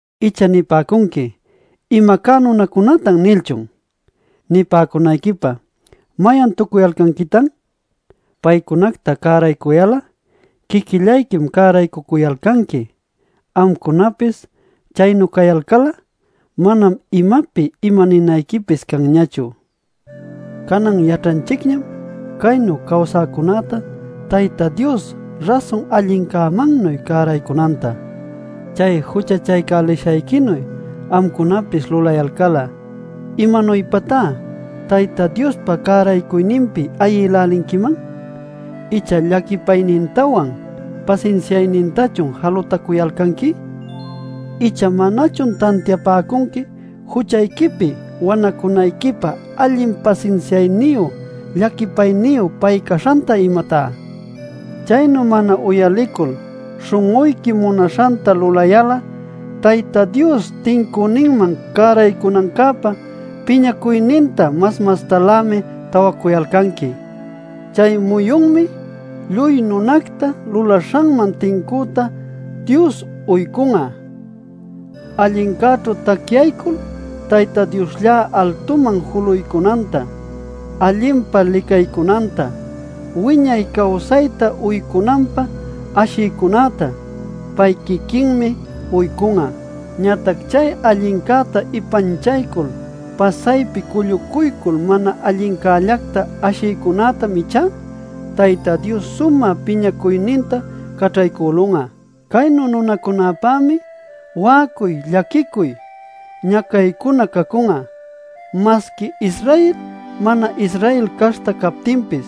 ¿Icha nipäcunqui “Ima cá nunacunatan” nilchun? ¿Nipäcunayquipä mayan tucuyalcanquitan? Paycunacta cäraycuyal'a quiquillayquim cäraycucuyalcanqui. Amcunapis chaynu cayalcal'a, manam imapi imaninayquipis canñachu. Canan yaćhanchicñam caynu cawsäcunäta Tayta Dios rasun allincämannuy cäraycunanta. Chay juchachaycälishayquinuy amcunapis lulayalcal'a ¿imanuypatá Tayta Diospa cäraycuyninpi ayïlälinquiman? Icha ¿llaquipaynintawan pasinsiaynintachun jalutacuyalcanqui? ¿Icha manachun tantiapäcunqui juchayquipi wanacunayquipä allin pasinsiayniyu llaquipayniyu pay caśhanta, imatá? Chaynu mana uyalicul śhun'uyqui munaśhanta lulayal'a Tayta Dios tincüninman cäraycunancäpä piñacuyninta mas mastalämi tawacuyalcanqui. Chay muyunmi “Lluy nunacta lulaśhanman tincüta Dios uycun'a” Allincäćhu tacyaycul Tayta Dioslla altuman juluycunanta, allinpa licaycunanta, wiñay cawsayta uycunanpä ashiycunätá pay quiquinmi uycun'a. Ñatac chay allincäta ipanchaycul pasaypi cullucuycul mana allincällacta ashïcunätam ichá, Tayta Dios sumä piñacuyninta caćhaycülun'a. Caynu nunacunapämi wa'acuy llaquicuy, ñacaycuna cacun'a, masqui Israel mana-Israel caśhta captinpis.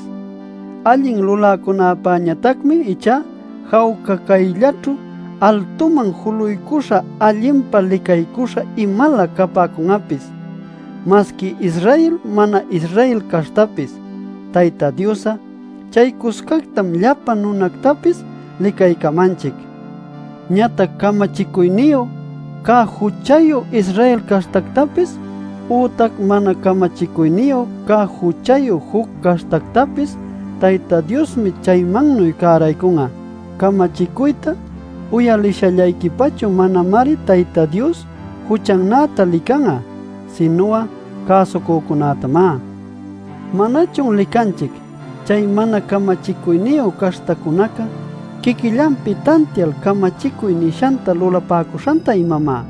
Allin luläcunapäñatacmi ichá jawca cayllaćhu altuman juluycuśha allinpa licaycuśha imalä capäcun'apis masqui Israel mana-Israel caśhtapis. Tayta Dios'a chaycuscactam llapa nunactapis licaycamanchic. Ñatac camachicuyniyu cä juchayu Israel caśhtactapis, ütac mana camachicuyniyu cä juchayu juc caśhtactapis Tayta Diosmi chaymannuy cäraycun'a. Camachicuyta uyalishallayquipachu manamari Tayta Dios juchannäta lican'a, sinu'a cäsucücunätamá. ¿Manachun licanchic chay mana camachicuyniyu caśhtacunaca quiquillanpi tantial camachicuy nishanta lulapäcuśhanta, imamá?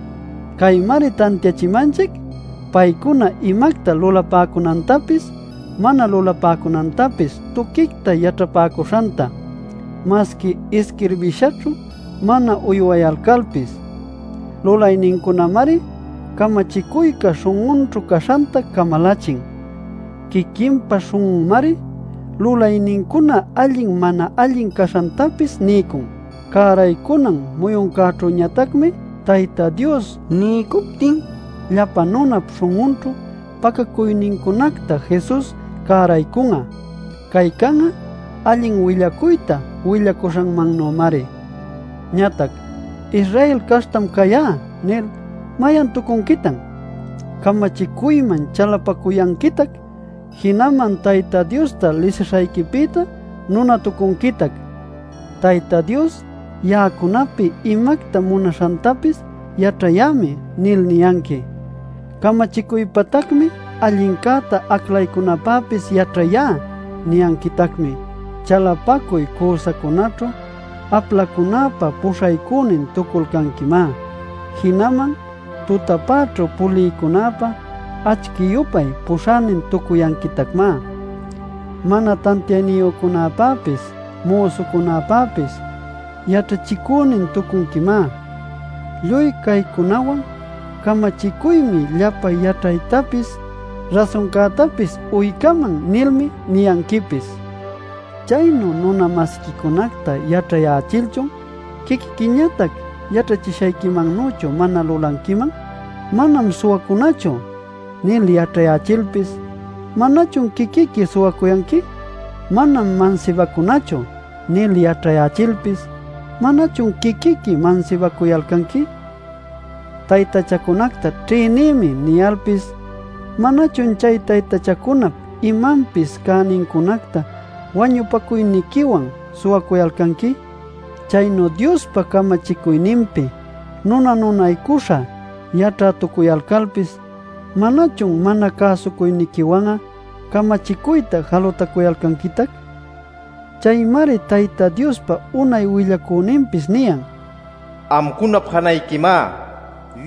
Caymari tantiachimanchic paycuna imacta lulapäcunantapis mana lulapäcunantapis tuquicta yaćhapäcuśhanta, masqui isquirbishaćhu mana uywayalcalpis. Lulaynincunamari camachicuyca śhun'unćhu caśhanta camalachin. Quiquinpa śhun'unmari lulaynincuna allin mana allin caśhantapis niycun. Cäraycunan muyuncäćhüñatacmi Tayta Dios niycuptin llapa nunap śhun'unćhu pacacuynincunacta Jesus cäraycun'a. Cay can'a allin willacuyta willacuśhämannümari. Ñatac “Israel caśhtam cayá” nil ¿mayan tucunquitan? Camachicuyman chalapacuyanquitac, jinaman Tayta Diosta lisishayquipïtá nunatucunquitac. “Tayta Dios ya'acunapi imacta munaśhantapis yaćhayämi” nil niyanqui. “Camachicuypatacmi allincäta aclaycunapäpis yaćhayá” niyanquitacmi. Chalapacuy cüsacunaćhu aplacunäpa puśhaycünin tucuyalcanquimá. Jinaman tutapäćhu pulïcunäpä acchi-yupay puśhänin-tucuyanquitacmá. Mana tantiayniyücunäpäpis müsucunäpäpis yaćhachicünin-tucunquimá. Lluy caycunawan “Camachicuymi llapa yaćhaytapis, rasuncätapis uycaman” nilmi niyanquipis. ¿Chaynu nuna-masiquicunacta yaćhayächilchun, quiquiquiñatac yaćhachishayquimannüchu mana lulanquiman? “Manam suwacunachu” nil yaćhayächilpis, ¿manachun quiquiqui suwacuyanqui? “Manam mansibacunachu” nil yaćhayächilpis, ¿manachun quiquiqui mansibacuyalcanqui? “Taytachacunacta ćhïnïmi” niyalpis ¿manachun chay taytachacunap imapis cänincunacta wañupacuyniquiwan suwacuyalcanqui? Chaynu Diospa camachicuyninpi nuna-nunaycuśha yaćhätucuyalcalpis, ¿manachun mana cäsucuyniquiwan'a camachicuyta jalutacuyanquitac? Chaymari Tayta Diospa unay willacüninpis niyan: “Amcunap janayquimá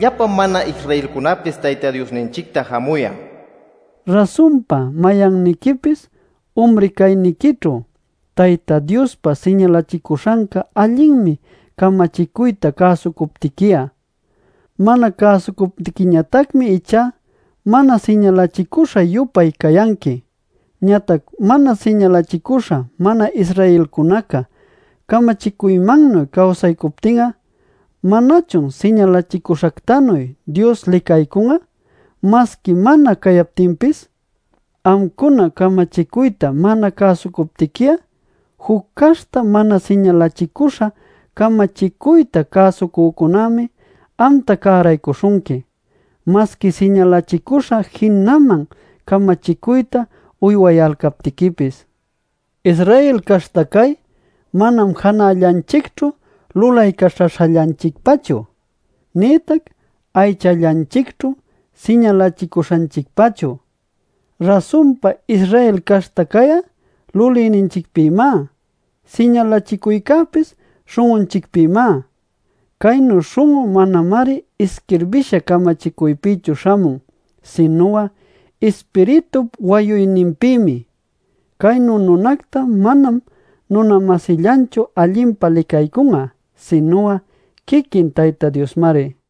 llapa mana-Israelcunapis Tayta Diosninchicta jamuyan” nil. Rasunpa, mayanniquipis umri cayniquićhu Tayta Diospä siñalachicuśhanca allinmi camachicuyta cäsucuptiqui'a. Mana cäsucuptiquiñatacmi ichá mana siñalachicuśha-yupay cayanqui. Ñatac mana siñalachicuśha mana-Israelcunaca, camachicuymannuy cawsaycuptin'a, ¿manachun siñalachicuśhactanuy Dios licaycun'a, masqui mana cayaptinpis? Amcuna camachicuyta mana cäsucuptiqui'a, juc caśhta mana siñalachicüśha camachicuyta cäsucücunämi amta cäraycälishunqui, masqui siñalachicüśha jinaman camachicuyta uywayalcaptiquipis. Israel caśhta cay, manam janällanchicćhu lulaycaćhaśhallanchicpachu; nïtac aychallanchicćhu siñalachicüśhanchicpachu. Rasunpa Israel caśhta cay'a lulïninchicpïmá; siñalachicuycäpis śhun'unchicpïmá. Caynu śhun'u manamari isquirbisha camachicuypïchu śhamun, sinu'a Ispiritup wayuyninpïmi. Caynu nunacta manam nuna-masillanchu allinpa licaycun'a sinu'a quiquin Tayta Diosmari.